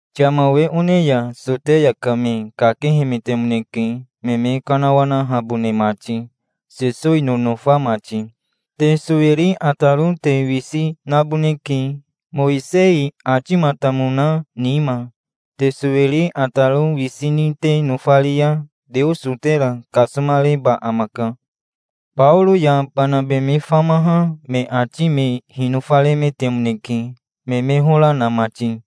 Yama we one ya Soteya ka me kakehemetemoneke, me me kanawanahabone mati, Sesowi nonofa mati. "Te sowiri ataro te wisi naboneke, Mowisei atimatamona nima. Te sowiri ataro wisi ni te nofari ya Teoso tera kasomareba amaka". Baoro ya Banabe me famaha me ati me hinofaremetemoneke, me me hora na mati.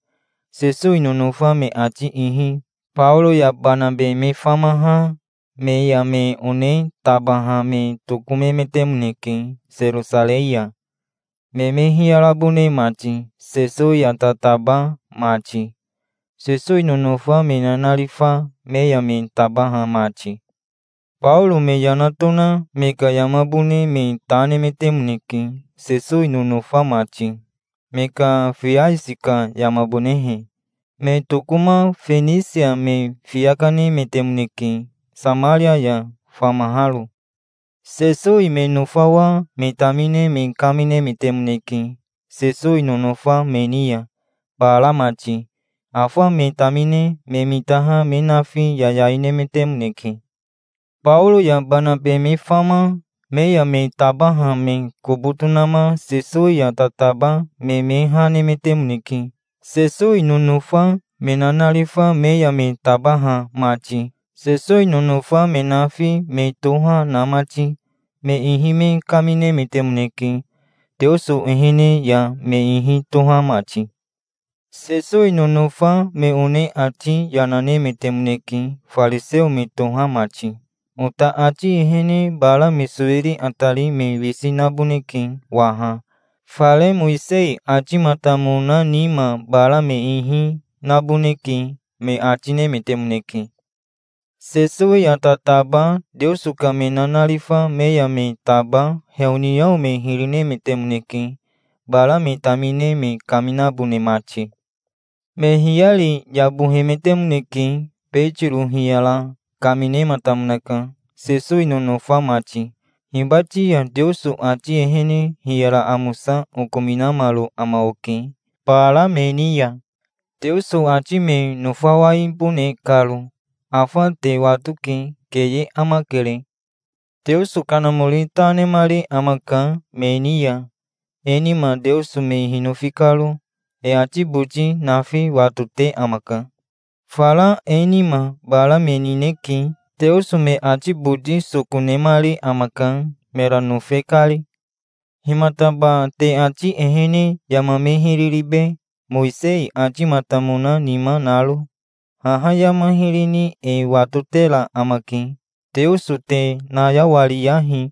Sesowi nonofa me ati ihi Baoro ya Banabe me famaha me ya me one tabaha me tokomemetemoneke Serosarei ya, me me hiyarabone mati, Sesowi ya tataba mati, Sesowi nonofa me nanarifa me ya me tabaha mati. Baoro me yana tona me ka yamabone me ta nemetemoneke, Sesowi nonofa mati, me ka fiasi ka yamabonehe. Me tokoma Fenisia me fiya kanemetemoneke, Samaria ya famaharo. Sesowi me nofawa me tamine me kaminemetemoneke Sesowi nonofa me ni ya, bara mati. Afa me tamine me mitaha me nafi yayai nemetemoneke. Baoro ya Banabe me fama me ya me tabaha me kobo tonama Sesowi ya tataba me me ha nemetemoneke, Sesowi nonofa me nanarifa me ya me tabaha mati, Sesowi nonofa me nafi me toha na mati. Me ihi me kaminemetemoneke, Teoso ehene ya me ihi toha mati. Sesowi nonofa me one ati yana nemetemoneke, fariseo me toha mati. "Ota ati ehene bara me sowiri atari me wisi naboneke waha. Fare Mowisei atimatamona nima bara me ihi naboneke", me ati nemetemoneke. Sesowi ya tataba Teoso ka me nanarifa me ya me taba heoniao me hiri nemetemoneke, bara me tamine me kaminabone mati. Me hiyari yabohemetemoneke. Betiro hiyara kaminematamonaka. "Sesowi nonofa mati, hibati ya Teoso ati ehene hiyara amosa okominamaro ama oke bara me ni ya, Teoso ati me nofawaibone karo. Afa te watoke. Keye amakere. Teoso Kanamori ta nemari amaka me ni ya, e nima, Teoso me hinofi karo. E ati boti nafi watote amaka. Fara e nima bara me nineke. Teoso me ati boti soko nemari amaka, mera nofe kari. Himataba te ati ehene yama me hiri ribe, Mowisei atimatamona nima naro? Haha yama hiri ni e watotera amake. Teoso te nayawariyahi.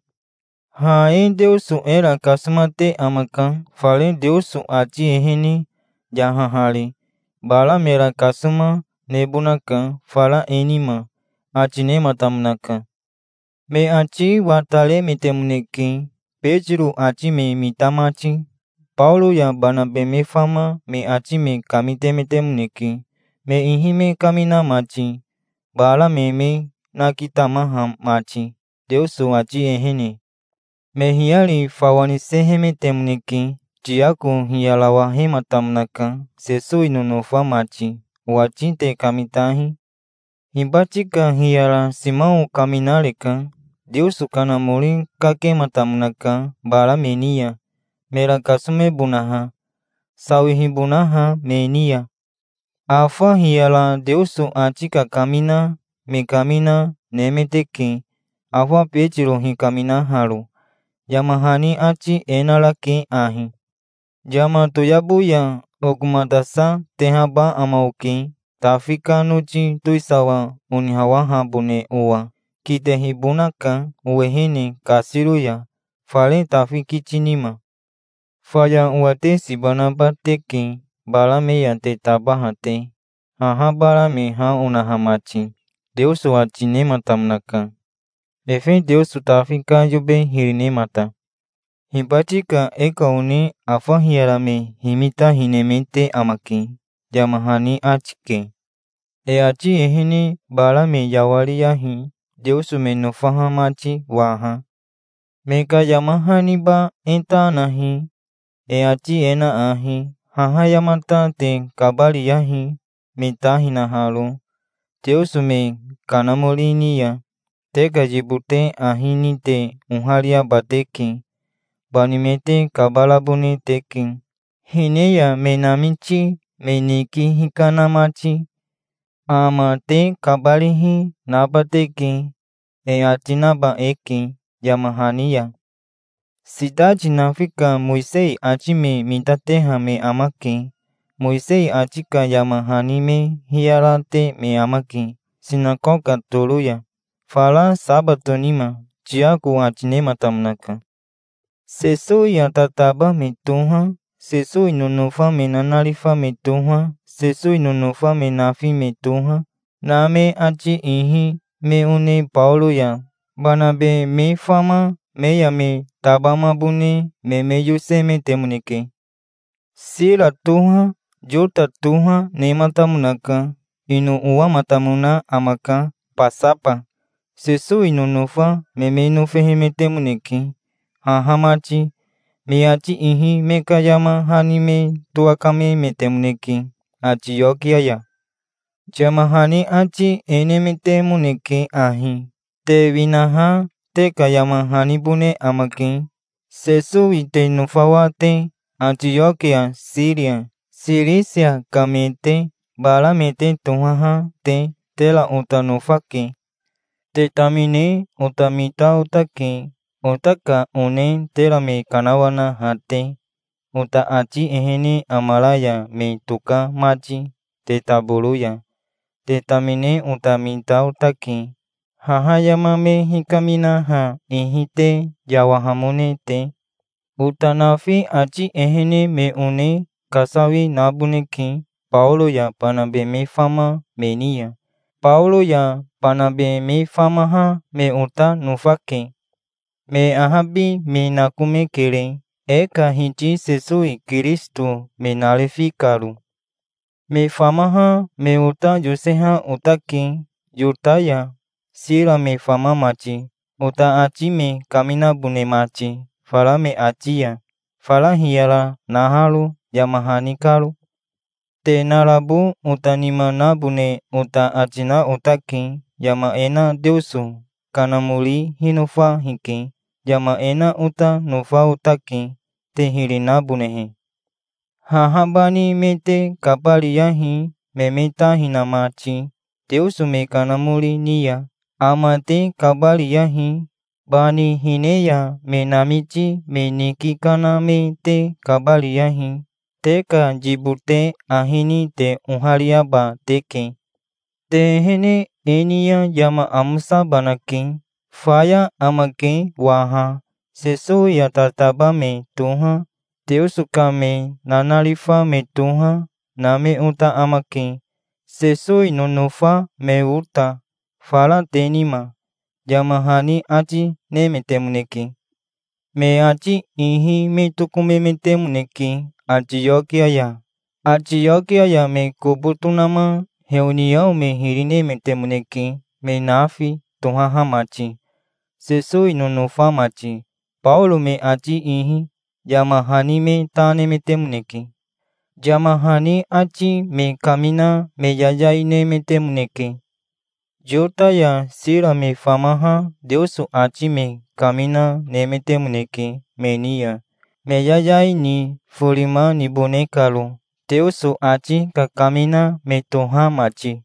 Ha e Teoso era kasomate amaka, fare Teoso ati ehene, yahahari. Bara mera kasoma, nebonaka, fara e nima", ati nematamonaka. Me ati wataremetemoneke, Betiro ati me mita mati. Baoro ya Banabe me fama me ati me kamitemetemoneke, me ihi me kamina mati, bara me me nakitamaha mati, Teoso ati ehene. Me hiyari fawa nisehemetemoneke. Tiako hiyarawahematamonaka. "Sesowi nonofa mati, owati te kamitahi. Hibati ka hiyara Simao kaminareka. Teoso Kanamori kakematamonaka bara me ni ya, mera kasomebonaha, sawihibonaha me ni ya. Afa hiyara Teoso ati kakamina me kamina nemeteke, afa Betiro hikaminaharo. Yama hani ati e narake ahi: '"Yama toyabo ya okomatasatehaba ama oke, Tafi ka noti towisawa onihawahabone owa. Kitehibonaka owehene kasiro ya fare Tafi kiti nima. Faya owa te siba naba teke, bara me ya te tabaha te, haha bara me ha onaha mati", Teoso ati nematamonaka, efe Teoso Tafi ka yobe hiri nemata. Hibati ka e ka one afa hiyara me himita hinemete amake', yama hani ati ke. E ati ehene bara me yawariyahi, Teoso me nofaha mati waha. Me ka yama haniba e ta nahi. E ati e na ahi: 'Haha yamata te kabariyahi, me ta hinaharo teoso me kanamori ni ya. Te ka yibote ahi ni te ohariaba teke. Bani me te kabarabone teke, hine ya me namiti me niki hikana mati. Ama te kabarihi, naba teke', e ati naba eke yama hani ya. Sitati nafi ka Mowisei ati me mitateha me amake. Mowisei ati ka yama hani me hiyarate me amake sinakoka toro ya, fara sabato nima", Tiako ati nematamonaka. Sesowi ya tataba me toha, Sesowi nonofa me nanarifa me toha, Sesowi nonofa me nafi me toha, na me ati ihi me one Baoro ya Banabe me fama me ya me tabamabone me me yosemetemoneke. Sira toha, Yota toha, nematamonaka. Ino owamatamona amaka Basaba. Sesowi nonofa me me nofehemetemoneke, haha mati. Me ati ihi me ka yama hani me towakamemetemoneke Atiokia ya. Yama hani ati e nemetemoneke ahi. "Te winaha te ka yama hanibone amake, Sesowi te nofawa te, Atiokia, Siria, Sirisia ka me te, bara me te tohaha te. Tera ota nofake. Te tamine ota mita otake, ota ka one tera me kanawanaha te, ota ati ehene amara ya me toka mati te taboro ya. Te tamine ota mita otake, haha yama me hikaminaha ihi te yawahamone te. Ota nafi ati ehene me one kasawi naboneke Baoro ya Banabe me fama me ni ya. Baoro ya Banabe me famaha me ota nofake. Me ahabi me nakomekere, e ka Hiti Sesowi Kirisito me narifi karo. Me famaha me ota yoseha otake, Yota ya Sira me fama mati, ota ati me kaminabone mati, fara me ati ya, fara hiyara naharo yama hani karo. Te narabo ota nima nabone ota ati na otake. Yama e na Teoso Kanamori hinofa hike. Yama e na ota nofa otake, te hiri nabonehe: Haha bani me te kabariyahi, me me ta hina mati teoso me kanamori ni ya. Ama te kabariyahi. Bani hine ya me namiti me niki kana me te kabariyahi. Te ka yibote ahi ni te ohariaba teke. Te ehene e ni ya yama amosabanake. Faya amake waha. Sesowi ya tataba me toha, Teoso ka me nanarifa me toha, na me ota amake, Sesowi nonofa me ota, fara te nima", yama hani ati nemetemoneke. Me ati ihi me tokomemetemoneke Atiokia ya. Atiokia ya me kobo tonama heoniao me hiri nemetemoneke me nafi tohaha mati, Sesowi nonofa mati, Baoro me ati ihi. Yama hani me ta nemetemoneke. Yama hani ati me kamina me yayai nemetemoneke. Yota ya Sira me famaha Teoso ati me kamina nemetemoneke me ni ya, me yayai ni forima nibone karo, Teoso ati kakamina me toha mati.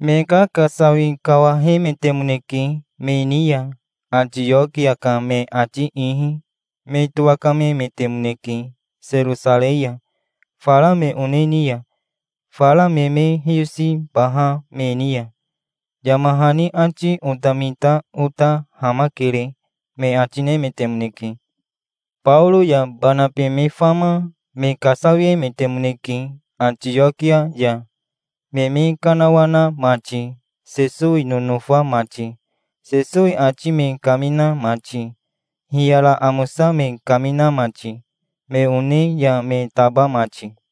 Me kakasawi kawahemetemoneke me ni ya. Atiokia ka me ati ihi me towakamemetemoneke Serosarei ya, fara me one ni ya, fara me me hiyosibaha me ni ya. "Yama hani ati ota mita ota hamakere", me ati nemetemoneke. Baoro ya Banabe me fama me kasawiemetemoneke Atiokia ya, me me kanawana mati, Sesowi nonofa mati, Sesowi ati me kamina mati, hiyara amosa me kamina mati, me one ya me taba mati.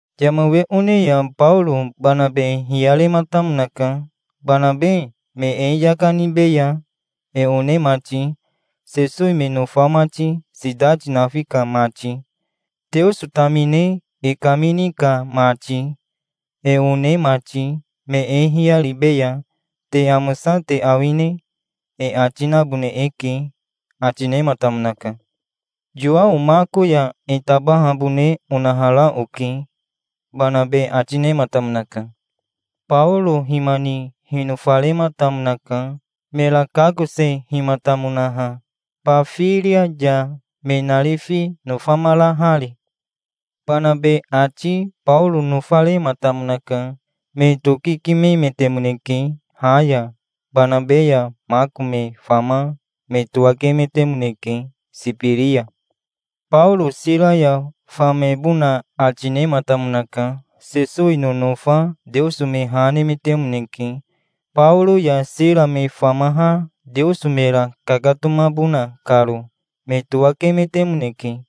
Yama we one ya Baoro Banabe hiyarematamonaka. "Banabe me e yaka nibeya, e one mati, Sesowi me nofa mati, sitati nafi ka mati, Teoso tamine e kamini ka mati, e one mati. Me e hiyaribeya. Te amosa te awine? e ati nabone eke", ati nematamonaka. "Yowao Mako ya e tabahabone onahara oke", Banabe ati nematamonaka. Baoro hima ni hinofarematamonaka, mera kakosehimatamonaha Bafiria ya, me narifi nofamarahari. Banabe ati Baoro nofarematamonaka. Me tokikimemetemoneke ha ya. Banabe ya Mako me fama me towakemetemoneke Sibiri ya. Baoro Sira ya famebona ati nematamonaka. Sesowi nonofa Teoso me ha nemetemoneke, Baoro ya Sira me famaha Teoso mera kakatomabona karo. Me towakemetemoneke.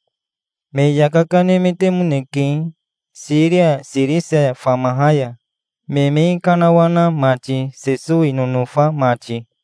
Me yaka kanemetemoneke, Siria Sirisia famaha ya, me me kanawana mati, Sesowi nonofa mati.